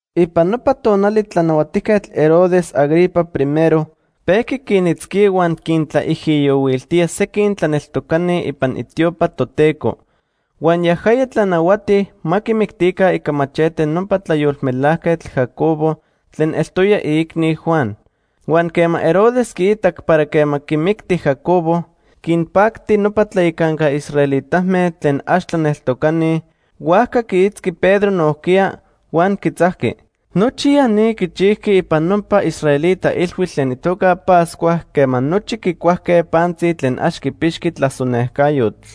Ipan nopa tonali Tlanahuatijquetl Herodes Agripa I pejqui quinitzquía huan quintlaijiyohuiltía sequin tlaneltocani ipan itiopa Toteco. Huan yajaya tlanahuati ma quimictica ica machete nopa tlayolmelajquetl Jacobo tlen eltoya iicni Juan. Huan quema Herodes quiitac para quema quimicti Jacobo quinpacti nopa tlayacanca israelitame tlen ax tlaneltocani, huajca quiitzqui Pedro nojquiya huan quitzajqui. Nochi ya ni quichijqui ipan nopa israelita ilhuitl tlen itoca Pascua quema nochi quicuajque pantzi tlen ax quipixqui tlasonejcayotl.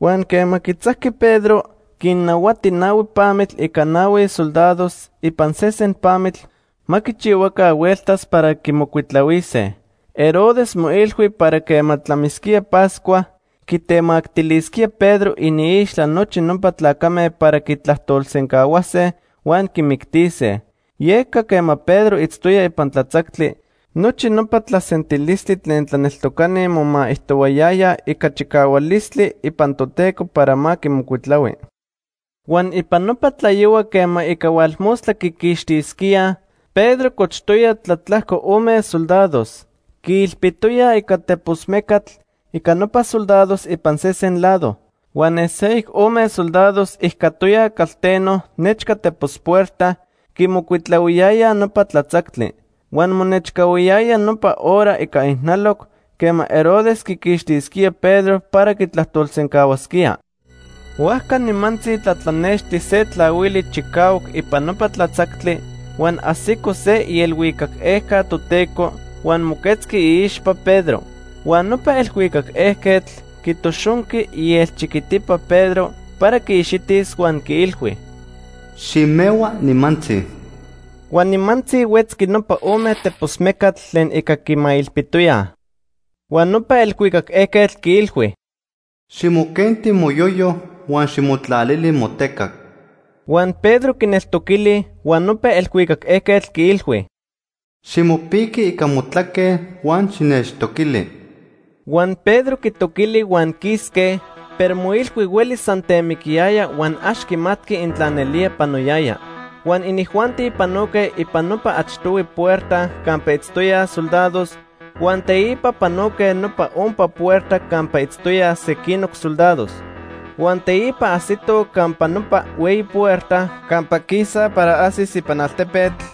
Huan quema quitzajqui Pedro, quinnahuati nahui pamitl ica nahui soldados ipan sesen pamitl ma quichihuaca hueltas para quimocuitlahuise. Herodes moilhui para quema tlamisquía Pascua, quitemactilisquía Pedro iniixtla nochi nopa tlacame para quitlajtolsencahuase huan quimictise. Yeca quema Pedro itztoya ipan tlatzactli, nochi nopa tlasentilistli tlen tlaneltocani momaijtohuayayaj ica chicahualistli ipan Toteco para ma quimocuitlahui. Huan ipan nopa tlayohua quema ica hualmostla quiquixtisquía, Pedro cochtoya tlatlajco ome soldados. Quiilpitoyaj ica tepos mecatl ica nopa soldados ipan sesen lado. Huan ne seyoc ome soldados ijcatoyaj calteno nechca tepos puerta, quimocuitlahuiyayaj nopa tlatzactli. Huan monechcahuiyaya nopa hora ica ijnaloc quema Herodes quiquixtisquía Pedro para quitlajtolsencahuasquía. Huajca nimantzi tlatlanexti se tlahuili chicahuac ipan nopa tlatzactli huan ajsico se ielhuicac ejca Toteco huan moquetzqui iixpa Pedro. Huan nopa elhuicac ejquetl quitoxonqui ielchiquitipa Pedro para quiixitis huan quiilhui: “Ximehua nimantzi.” Huan nimantzi huetzqui nopa ome tepos mecatl tlen ica quimailpitoyaj. Huan nopa elhuicac ejquetl quiilhui: “Ximoquenti moyoyo, huan ximotlalili motecac.” Huan Pedro quineltoquili, huan nopa elhuicac ejquetl quiilhui: “Ximopiqui ica motlaque huan xinechtoquili.” Huan Pedro quitoquili huan quisque, pero moilhui huelis san temiquiyaya huan ax quimatqui intla nelía panoyaya. Huan inijuanti panoque ipan nopa achtohui puerta campa itztoyaj soldados, huan teipa panoque nopa ompa puerta campa itztoyaj sequinoc soldados. Huan teipa ajsitoj campa nopa hueyi puerta campa quisaj para ajsis ipan altepetl,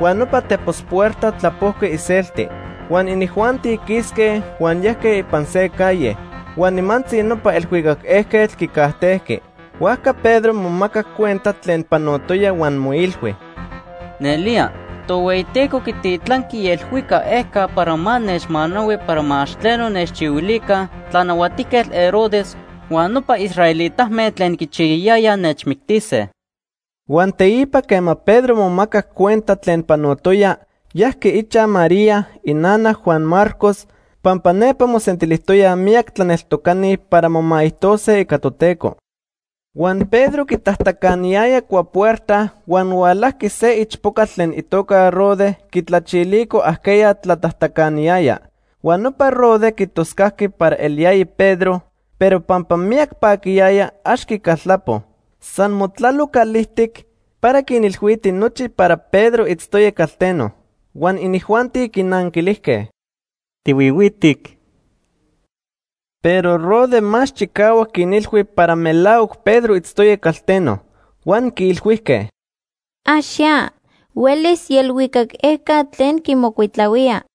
huan nopa tepos puerta tlapojqui iselti. Huan inijuanti quisque huan yajque ipan se calle. Huan nimantzi nopa elhuicac ejquetl quicajtejqui. Huajca Pedro momacac cuenta tlen panotoya huan moilhui: “Nelía, Tohueyiteco quititlanqui ielhuicac ejca para ma nechmanahui para ma ax tleno nechchihuilica Tlanahuatijquetl Herodes huan nopa israelitame tlen quichiyayayaj nechmictise.” Huan teipa quema Pedro momacac cuenta tlen panotoya, yajqui ichaj María, inana Juan Marcos, pampa nepa mosentilijtoyaj miyac tlaneltocani para momaijtose ica Toteco. Huan Pedro quitajtacaniyaya cuapuerta, huan hualajqui se ichpocatl tlen itoca Rode quitlachilico ajqueya tlatajtacaniyaya. Huan nopa Rode quitoscajqui para eliyaya Pedro, pero pampa miyac paquiyaya, ax quicaltlapo. San motlalo calijtic para quinilhuiti nochi para Pedro itztoya calteno. Huan inijuanti quinanquilijque: ―¡Tihuihuitic! Pero Rode más chicahuac quinilhui para melahuac Pedro itztoya calteno. Huan quiilhuijque: ―Ax ya. Huelis ielhuicac ejca tlen quimocuitlahuía.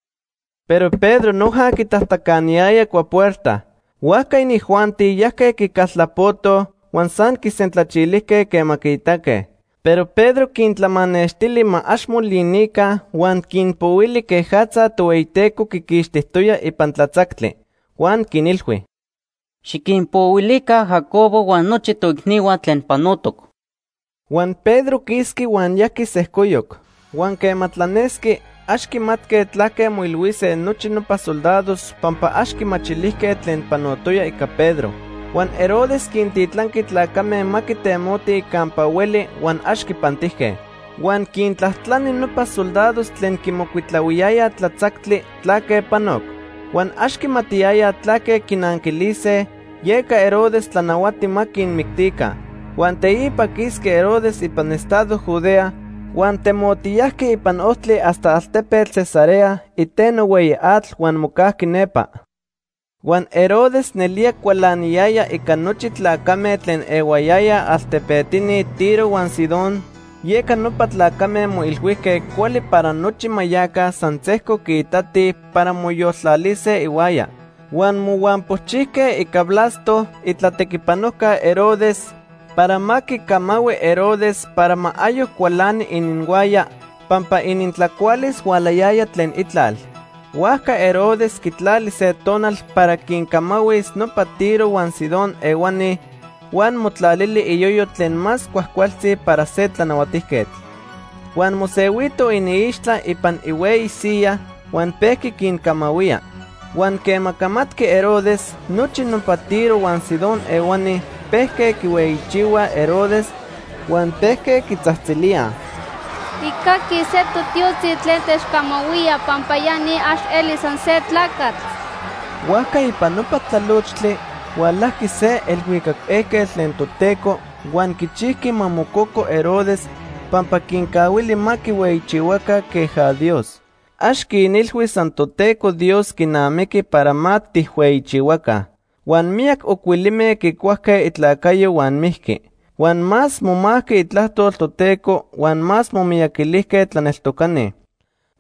Pero Pedro noja quitajtacaniyaya cuapuerta. Huajca inijuanti yajque quicaltlapotoj huan san quisentlachilijque quema quiitaque. Pero Pedro quintlamanextili ma ax molinica huan quinpohuili quejatza Tohueyiteco quiquixtijtoya ipan tlatzactli. Huan quinilhui: ―Xiquinpohuilica Jacobo huan nochi toicnihua tlen panotoc. Huan Pedro quisqui huan yajqui sejcoyoc. Huan quema tlanesqui, ax quimatque tlaque moilhuise nochi nopa soldados pampa ax quimachilijque tlen panotoya ica Pedro. Huan Herodes quintitlanqui tlacame ma quitemotij campa hueli huan ax quipantijque. Huan quintlajtlani nopa soldados tlen quimocuitlahuiyayaj tlatzactli tlaque panoc. Huan ax quimatiyayaj tlaque quinanquilise, yeca Herodes tlanahuati ma quinmictica. Huan teipa quisqui Herodes ipan estado Judea, huan temotiyajqui ipan ojtli hasta altepetl Cesarea iteno hueyi atl huan mocajqui nepa. Huan Herodes nelía cualaniyaya ica nochi tlacame tlen ehuayayaj altepetini Tiro huan Sidón, yeca nopa tlacame moilhuijque cuali para nochi ma yaca san sejco quiitatij para moyoltlalise ihuaya. Huan mohuampochijque ica Blasto, itlatequipanojca Herodes, para ma quicamahui Herodes para ma ayoc cualani ininhuaya, pampa inintlacualis hualayaya tlen itlal. Huajca Herodes quitlali se tonal para quincamahuis nopa Tiro huan Sidón ehuani huan motlalili iyoyo tlen más cuajcualtzi para se tlanahuatijquetl. Huan mosehuito iniixtla ipan ihueyi siyaj huan pejqui quincamahuía. Huan quema camatqui Herodes, nochi nopa Tiro huan Sidón ehuani pejque quihueyichihuaj Herodes huan pejque quitzajtzilíaj: “Tijcaquij se totiotzi tlen techcamahuía pampa ya ni ax elij san se tlacatl.” Huajca ipan nopa tlalochtli hualajqui se elhuicac ejquetl tlen Toteco huan quichijqui ma mococo Herodes pampa quincahuili ma quihueyichihuaca queja Dios. Ax quinilhui san Toteco Dios quinamiqui para ma tijhueyichihuaca. Huan miyac ocuilime quicuajque itlacayo huan mijqui. Huan más momajqui itlajtol Toteco huan más momiyaquilijque tlaneltocani.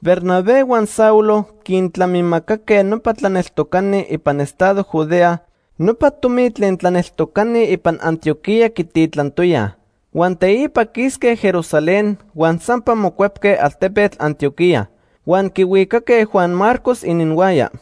Bernabé huan Saulo quintlamimacaque nopa tlaneltocani ipan estado Judea nopa tomi tlen tlaneltocani ipan Antioquía quititlantoyaj. Huan teipa quisque Jerusalén huan sampa mocuepque altepetl Antioquía. Huan quihuicaque Juan Marcos ininhuaya.